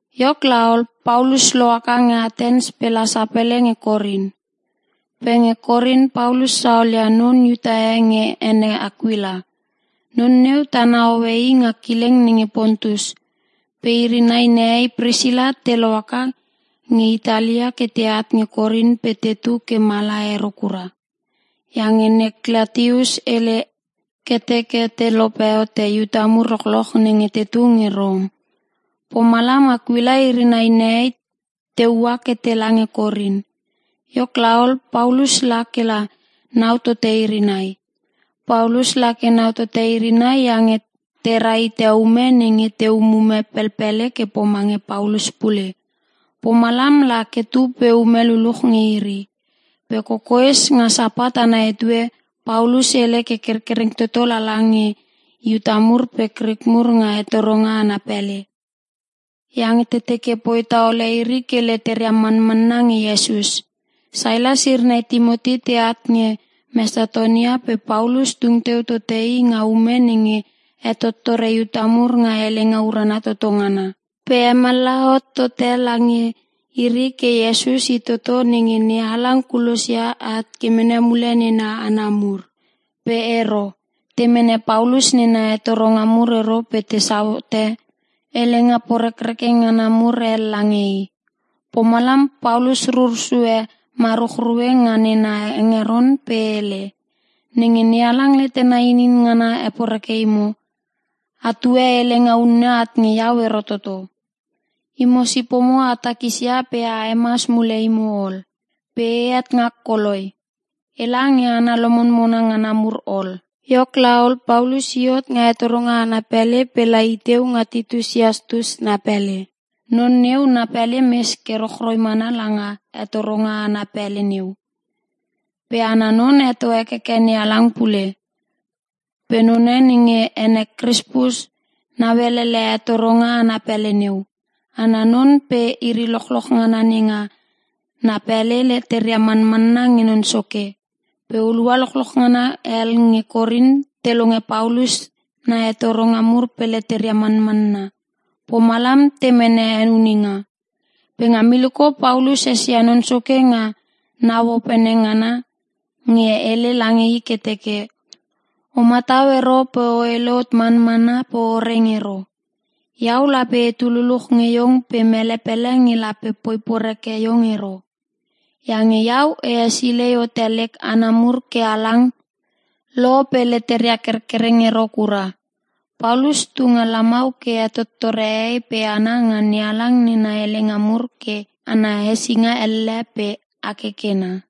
Iok laol, Paulus lohaka nge Atens pe la sapele nge Korin. Pe nge Korin Paulus saolia non Iuta e nge ene Akuila. Non neu tana hoe i nga kileng nenge Pontus. Pe iri nai nehei Prisila te lohaka nge Itali ke teat nge Korin pe tetu ke mala ero kura. Iange Ne Klatius hele ke teke te lope hote Iuta mur lochloch nenge tetu nge Rom. Pomalam Akuila iri nai nehei te ua ke tela nge Korin. Iok laol, Paulus la kela nau tote iri nai. Paulus lake nau tote iri nai iange tera hite ume nenge te umume pelpele ke pomange Paulus pule. Pomalam lake tu pe ume luluch nge iri. Pe kokoes nga Sapat ana etue, Paulus hele ke kerkereng toto lala nge Iuta mur pe Krik mur nga hetoronga ana pele. Iange teke poi taole iri ke leteria manmanna nge Iesus. Sailas iri nai Timoti teat nge Mesatonia pe Paulus tung teu tote i nga ume nenge hetottore Iuta mur nga helenga urana toto ngana. Pe hemallaha hot tote lange iri ke Iesus i toto nenge NeHalang kulosia at ke mene mule nena hana mur. Pe ero. Te mene Paulus nena hetoronga mur ero pe tesau hote helenga porekreke ngana mur hel lange i. Pomalam Paulus rur sue maruchrue nga nena hengeron pe hele, “Nenge NeHalang letena inin ngana heporeke imo, atue helenga unne at nge iau ero toto. Imo sipomo a takisia pe a hemas mule imo ol. Pe ehet ngak koloi. Ela nge hana lomonmona ngana mur ol.” Iok laol, Paulus i hot nga hetoronga ana pele pe la iteu nga Titus Iastus na pele. Non neu na pele mes ke rochroi mana langa hetoronga ana pele neu. Pe ana non heto hekeke NeHalang pule. Pe non nenge ene Krispus, nauelele hetoronga ana pele neu. Ana non pe iri lochloch ngana nenga na pele leteria manmanna nge Non Soke. Pe hulua lochloch ngana hel nge Korin te longe Paulus na hetoronga mur pe leteria manmanna. Pomalam te mene henuninga. Pe nga miliko Paulus esia Non Soke nga nau opene ngana nge hele lange i ke teke, “O matau ero pe o hele hot manmana pe o reng ero. Iau lape etu luluch nge iong pe mele pele nge lape poi poreke iong ero. Iange iau e hesilei hote lek hana mur ke halang lo pe leteria kerkereng ero kura.” Paulus tu nga lamau ke hetottore hehei pe hana nga NeHalang nena helenga mur ke ana hesinga elle pe akekena.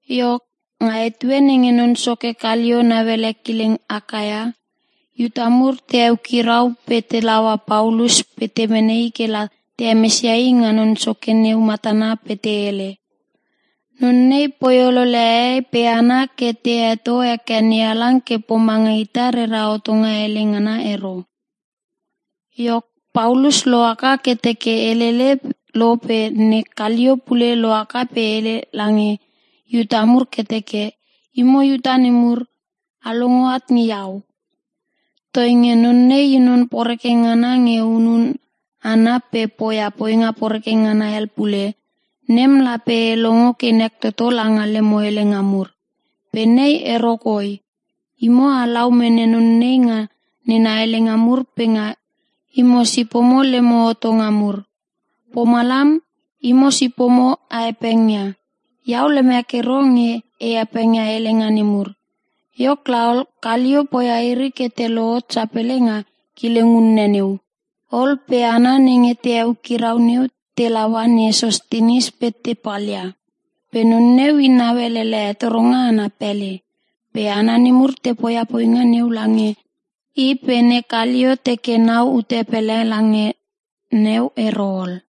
Iok, nga etue nenge non soke Kalio nauele kileng Akaia, Iuta mur te eukirau pe telaua Paulus pe te mene i kela te hemesia i nga non soke neu matana pe te hele, “Non nei poi olole hehei pe hana ke te heto heke NeHalang ke pomanga ita rera hotonga hele ngana ero.” Iok, Paulus lohaka ke teke helele lo pe ne Kalio pule lohaka pe hele lange Iuta mur ke teke, “Imo Iuta nemur, a longo at nge iau. Toinge non nei i non poreke ngana nge hunun hana pe poia poinga poreke ngana hel pule, nem lape e longo ke nek toto langa lemo helenga mur. Pe nei ero koi. Imo alau mene non nei nga nena helenga mur pe nga imo sipomo lemo hotonga mur. Pomalam, imo sipomo a hepengia. Iau lemek ero nge e hepengia helenga nemur.” Iok laol, Kalio poia iri ke te lohot sapele nga kileng unne neu. Ol pe hana nenge te eukirau neu telaua ne Sostinis pe te palia. Pe non neu i nauelele hetoronga ana pele, pe hana nemur te poia poinga neu lange i pe ne Kalio teke na ute pele langa neu ero ol.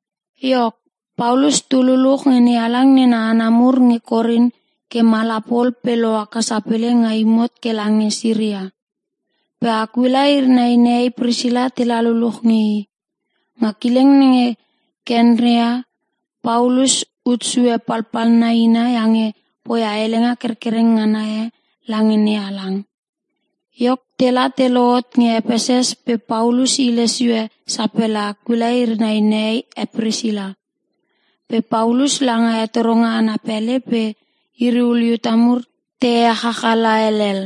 Iok, Paulus tu luluch nge NeHalang nena hana mur nge Korin ke mala pol pe lohaka sapele nga imot ke lange Siria. Pe Akuila iri nai nehei Prisila tela luluch nge i. Nga kileng nenge Kenkrea, Paulus utsue palpalna ina iange poia helenga kerkereng ngana e lange NeHalang. Iok, tela te lohot nge Epeses pe Paulus hile sio sapele Akuila iri nai nehei e Prisila. Pe Paulus langa hetoronga ana pele pe iri ul Iuta mur te echachala helel.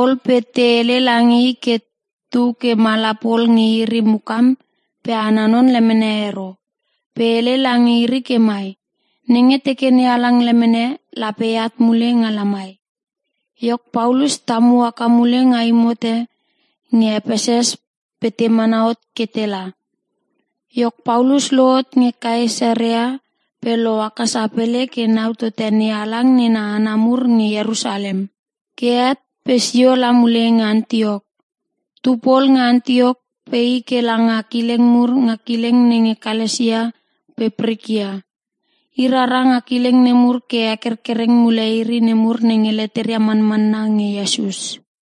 Ol pe te hele lange i ke tu ke mala pol nge iri mukam pe ana non lemene ero. Pe hele lange iri ke mai, “Nenge teke NeHalang lemene, lape eat mule nga lamai.” Iok, Paulus tamu haka mule nga imot e nge Epeses pe te mana hot ke tela. Iok, Paulus lohot nge Kaesarea pe loaka sapele ke nau tote NeHalang nena hana mur nge Ierusalem. Ke het pe sio la mule nge Antiok. Tu pol nge Antiok pe i ke langa kileng mur nga kileng nenge Kalasia pe Prikia. I rara nga kileng nemur ke hekerkereng mule iri nemur nenge leteria manmanna nge Iesus.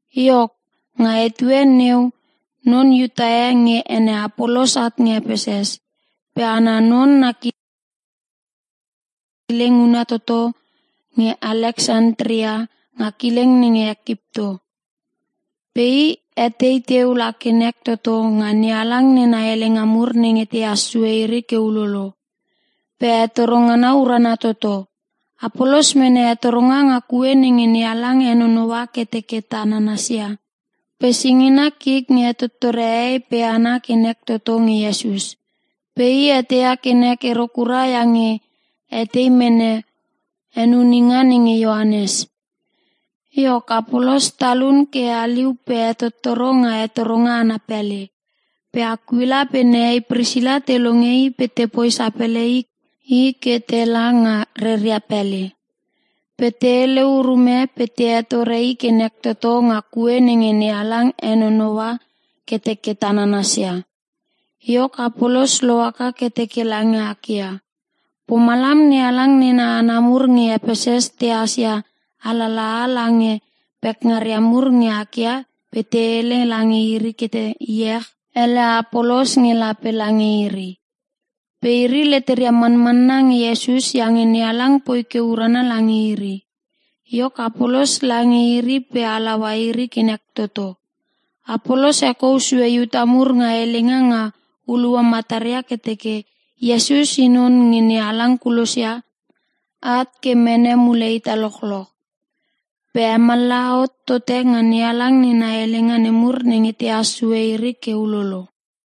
Iok, nga etue neu non Iuta e nge ene Apolos at nge Epeses. Pe ana non na kileng huna toto nge Aleksantria nga kileng nenge Ekipto. Pe i etei teu la ke nek toto nga NeHalang nena helenga mur nenge tehas sue iri ke ulolo. Pe hetoro ngana urana toto. Apolos mene hetoronga nga Kue Nenge NeHalang Henonoua Ke Teke Ta nanasia, pe singina kik nge hetottore hehei pe hana ke nek toto nge Iesus. Pe i eteia ke nek ero kura iange hetei mene henuninga nenge Ioanes. Iok, Apolos talun ke haliu pe hetottoro nga hetoronga ana pele. Pe Akuila pe nehei Prisila te longe i pe tepoi sapele i ke tela nga reria pele. Pe te hele urume pe te hetore i ke nek toto nga Kue Nenge NeHalang Henonoua Ke Teke Ta nanasia. Iok Apolos lohaka ke teke lange Akaia. Pomalam NeHalang nena hana mur nge Epeses tehas ia alalaha lange pekngaria mur nge Akaia pe te hele lange iri ke te iech ele Apolos nge lape lange iri. Pe iri leteria manmanna nge Iesus iange NeHalang poi ke urana lange iri. Iok Apolos lange iri pe halaua iri ke nek toto. Apolos hekou sue Iuta mur nga helenga nga hulua mataria ke teke Iesus i non nenge NeHalang kulosia at ke mene mule ita lochloch. Pe hemallaha hot tote nga NeHalang nena helenga nemur nenge tehas sue iri ke ulolo.